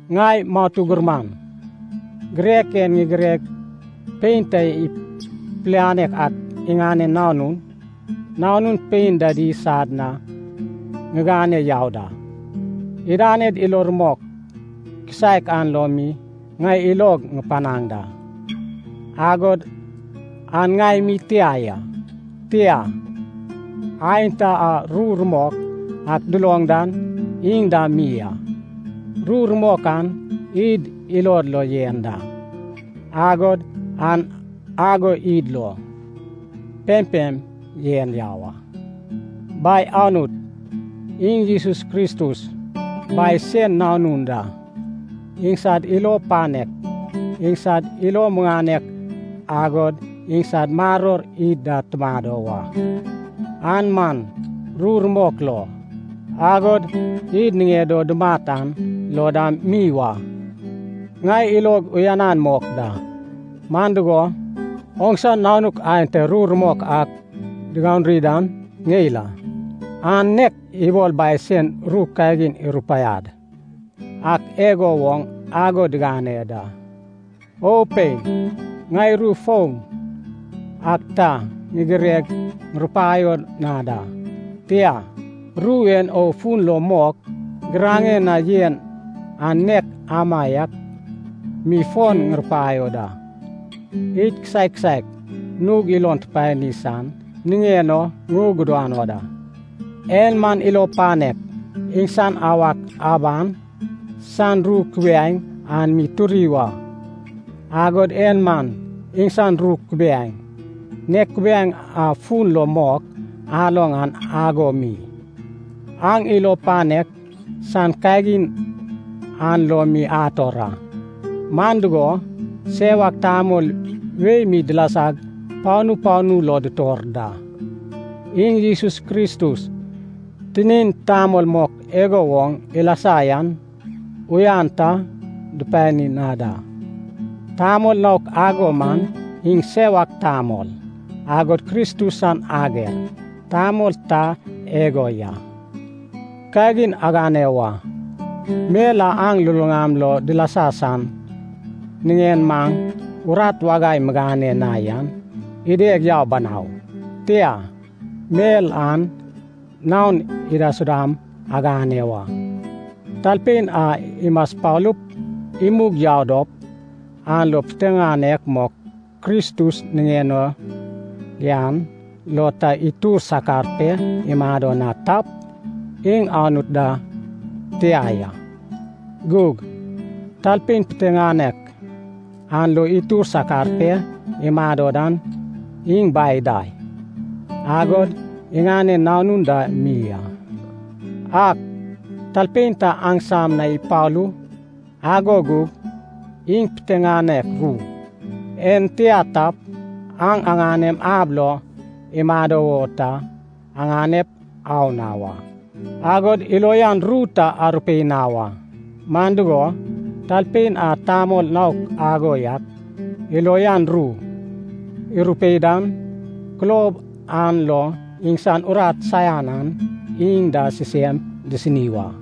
Ŋai matu gurman, girek en ŋigireg pein ta pilianek ak iŋanen nanun, nanun pein dadi sad na ŋigane yau da. Idaned ilo rumok kisaek an lo mi ŋai ilog ŋupanaŋ da, agod an ŋai mi tia ya. Tia, aenta a ru rumok ak duloŋ dan iŋ dam mi a. Ru rumok an id ilod lo yen da, agod an ago id lo pempem yen yau a. Bai Anut, iŋ Jesus Kristus Bai sen Nanun da, iŋsad ilo panek, iŋsad ilo muŋanek agod iŋsad maror id da tumado wa, an man ru rumok lo, agod id niŋed o dumat an lo dam mi wa. Ŋai ilog uyanan mok da, man dugo, oŋsa nanuk aenta ru rumok ak diganuri dan ŋeil a, an nek ibol Bai sen ru kagin irupaiad ak igo woŋ ago digane da. O pein, ŋai ru foun ak ta ŋigireg ŋurupaio na da, tia, ru en o fun lo mok giraŋe na yen an nek amaiak mi fon ŋurupaio da. Id kisaek kisaek nug ilon tupani san niŋen o ŋugudano da. En man ilo panek, iŋsan awak aban san ru kubiaeŋ an mi turi wa. Agod en man iŋsan ru kubiaeŋ, nek kubaieŋ a fun lo mok aloŋ an ago mi, aŋ ilo panek san kagin an lo mi ator a. Man dugo, sewak tamol wei mi dilasag panu panu lo dutor da. Iŋ Jesus Kristus tinin tamol mok igo woŋ ilasa yan uyan ta dupani na da. Tamol naok ago man iŋ sewak tamol, agod Kristus san ager tamol ta igo ya. Kagin agane wa. Mel a aŋ luluŋam lo dilasa san niŋen maŋ urat wagai migane na yan ideg yau banau. Tia, mel an naon idaisudam aŋane wa. Talpein a imaspalup imug yau dop, an lo piteŋanek mok Kristus niŋen o yan lo ta itur sakar pe imado na tap, iŋ Anut da tia ya. Gug talpein piteŋanek an lo itur sakar pe imado dan iŋ Bai da, agod iŋanen Nanun da mi a. Ak talpein ta aŋsam na ipalu, ago gug iŋ piteŋanek ru en tia tap, aŋ aŋanem ab lo imado wo ta aŋanep au na wa. Agod ilo uyan ru ta arupei na wa. Man dugo, talpein a tamol naok ago yak ilo uyan ru irupei dan, kulob an lo iŋsan urat saian an iŋ da sisem disini wa.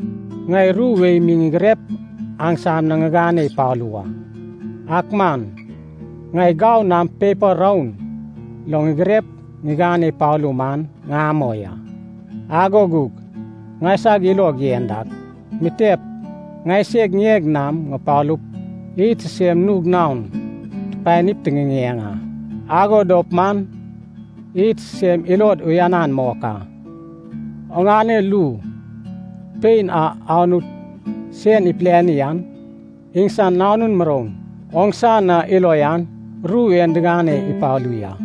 Ŋai ru wei mi ŋigirep aŋsam na ŋigane ipalu wa. Ak man ŋai gau nam pepa roun lo ŋigirep ŋigane ipalu man ŋamoi a. Ago gug ŋaisag ilog yen dak, mitep ŋaiseg ŋieg nam ŋupalup id sisem nug naon tupanip tiŋiŋeŋ a. Ago dop man id sisem ilod uyanan mok a. Oŋane lu (pein) a Anut sen ipiliani an, iŋsan nanun muroun oŋsa na ilo uyan ru en digane ipalu ya.